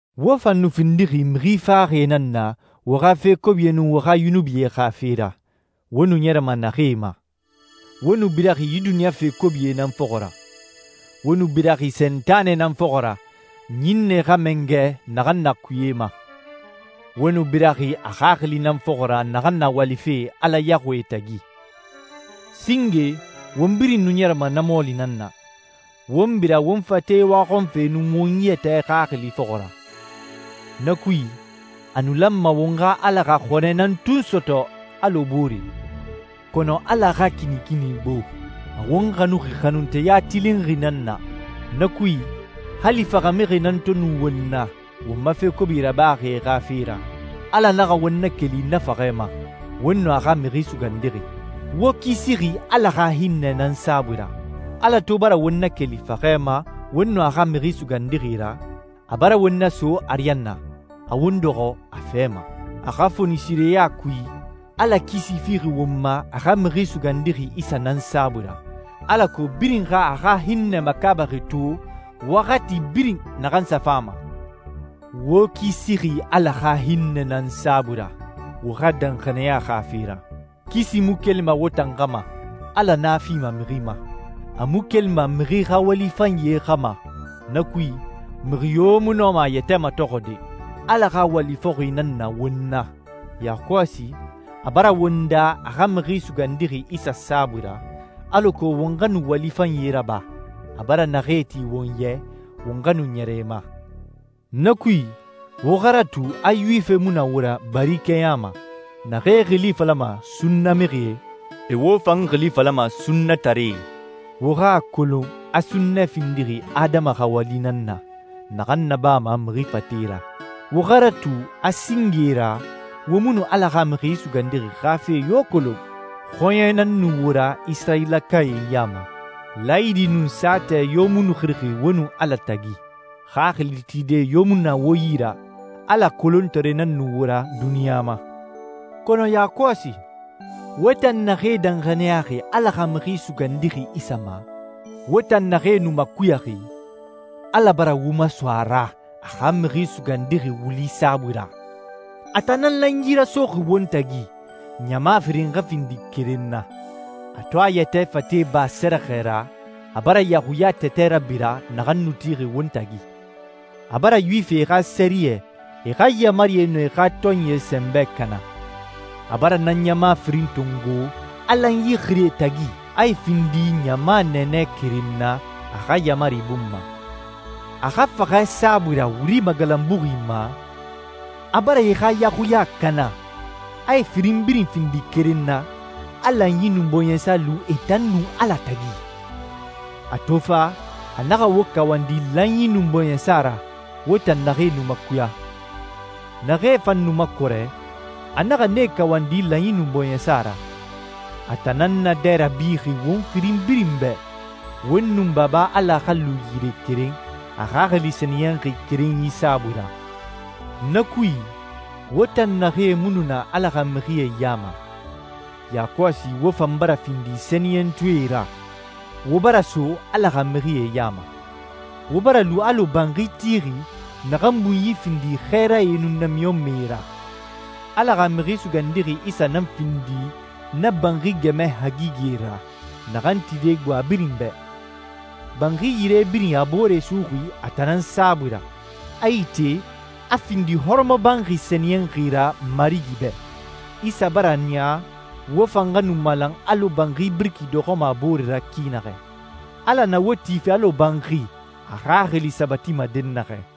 Wo fan nu findixi mixi faxaxie nan na wo xa fe kobie nun wo xa yunubie xa fe ra wo nu ɲɛrɛma naxee ma. Wo nu biraxi yi duniɲa fe kobie nan fɔxɔ ra. Wo nu biraxi Sentanɛ nan fɔxɔ ra, ɲinnɛe xa mangɛ naxan na kuye ma. Wo nu biraxi a xaxili nan fɔxɔ ra naxan na walife Ala yaxuie tagi. Singe, won birin nu ɲɛrɛma na mɔɔli nan na, won bira won fate waxɔnfe nun won yɛtɛ xaxili fɔxɔ ra. Na kui, a nu lanma won xa Ala xa xɔnɛ nan tun sɔtɔ alɔ booree. Kɔnɔ Ala xa kinikini gbo. A won xanuxi xanunteya tilinxi nan na. Na kui, hali faxamixie nan to nu won na won ma fe kobi rabaxie xa fe ra, Ala naxa won nakeli na faxɛ ma, won nun a xa Mixi Sugandixi. Wo kisixi Ala xa hinnɛ nan saabui ra. Ala to bara won nakeli faxɛ ma won nun a xa Mixi Sugandixi ra, a bara won naso ariyanna, a won dɔxɔ a fɛ ma. A xa fonisireya kui, Ala kisi fixi won ma a xa Mixi Sugandixi Isa nan saabui ra, alako birin xa a xa hinnɛ makaabaxi to waxati birin naxan sa fama. Wo kisixi Ala xa hinnɛ nan saabui ra, wo xa danxaniya xa fe ra. Kisi mu kelima wo tan xa ma, Ala nan a fima mixi ma. A mu kelima mixi xa wali fanyie xa ma. Na kui, mixi yo mu nɔma a yɛtɛ matɔxɔde. Ala xa wali fɔxi nan na won na. Yakɔsi, a bara won daa a xa Mixi Sugandixi Isa saabui ra, alako won xa nu wali fanyie raba, a bara naxee ti won ya i won xa nu ɲɛrɛ e ma. Na kui, wo xa ratu a Yuwifie mu wo ra bari kɛɲa ma. Naxee xili falama «sunnamixie», e wo fan xili falama «sunnataree». Wo xa a kolon a sunnɛ findixi adama xa wali nan na, naxan nabama mixi fate ra. Wo xa ratu a singe ra wo mu nu Ala xa Mixi Sugandixi xa fe yo kolon. Xɔɲɛe nan nu wo ra Isirayilakae ya ma. Laayidi nun saatɛ yo mu nu xirixi wo nun Ala tagi. Xaxili tide yo mu nu na wo yi ra, Ala kolontaree nan nu wo ra duniɲa ma. Kɔnɔ yakɔsi, wo tan naxee danxaniyaxi Ala xa Mixi Sugandixi Isa ma, wo tan naxee nu makuyaxi, Ala bara wo maso a ra a xa Mixi Sugandixi wuli saabui ra. A tan nan lanyi rasoxi won tagi, ɲama firin xa findi keren na. A to a yɛtɛ fate ba sɛrɛxɛ ra, a bara yaxuya tɛtɛ rabira naxan nu tixi won tagi. A bara Yuwifie xa sɛriyɛ, e xa yaamarie, nun e xa tɔnyie sɛnbɛ kana. A bara na ɲama firin tongo, a lanyi xiri e tagi, a e findi ɲama nɛɛnɛ keren na a xa yaamari bun ma. A xa faxɛ saabui ra wuri magalanbuxi ma, a bara e xa yaxuya kana, a e firin birin findi keren na, a lanyi nun bɔɲɛsa lu e tan nun Ala tagi. A to fa, a naxa wo kawandi lanyi nun bɔɲɛsa ra, wo tan naxee nu makuya. Naxee fan nu makɔrɛ, a naxa nee kawandi lanyi nun bɔɲɛsa ra. A tan nan naadɛ rabixi won firin birin bɛ, won nun Baba Ala xa lu yire keren, a Xaxili Sɛniyɛnxi kerenyi saabui ra. Na kui, wo tan naxee mu nu na Ala xa mixie ya ma, yakɔsi wo fan bara findi sɛniyɛntɔɛe ra, wo bara so Ala xa mixie ya ma. Wo bara lu alɔ banxi tixi naxan bunyi findi xɛɛrae nun namiɲɔnmɛe ra. Ala xa Mixi Sugandixi Isa nan findi na banxi gɛmɛ hagigɛ ra naxan tide gbo a birin bɛ. Banxi yire birin a boore suxuxi a tan nan saabui ra, a ite, a findi hɔrɔmɔbanxi sɛniyɛnxi ra Marigi bɛ. Isa bara a niya wo fan xa nu malan alɔ banxi biriki dɔxɔma a boore ra ki naxɛ. Ala na wo tife alɔ banxi a Xaxili sabatima dɛnnaxɛ.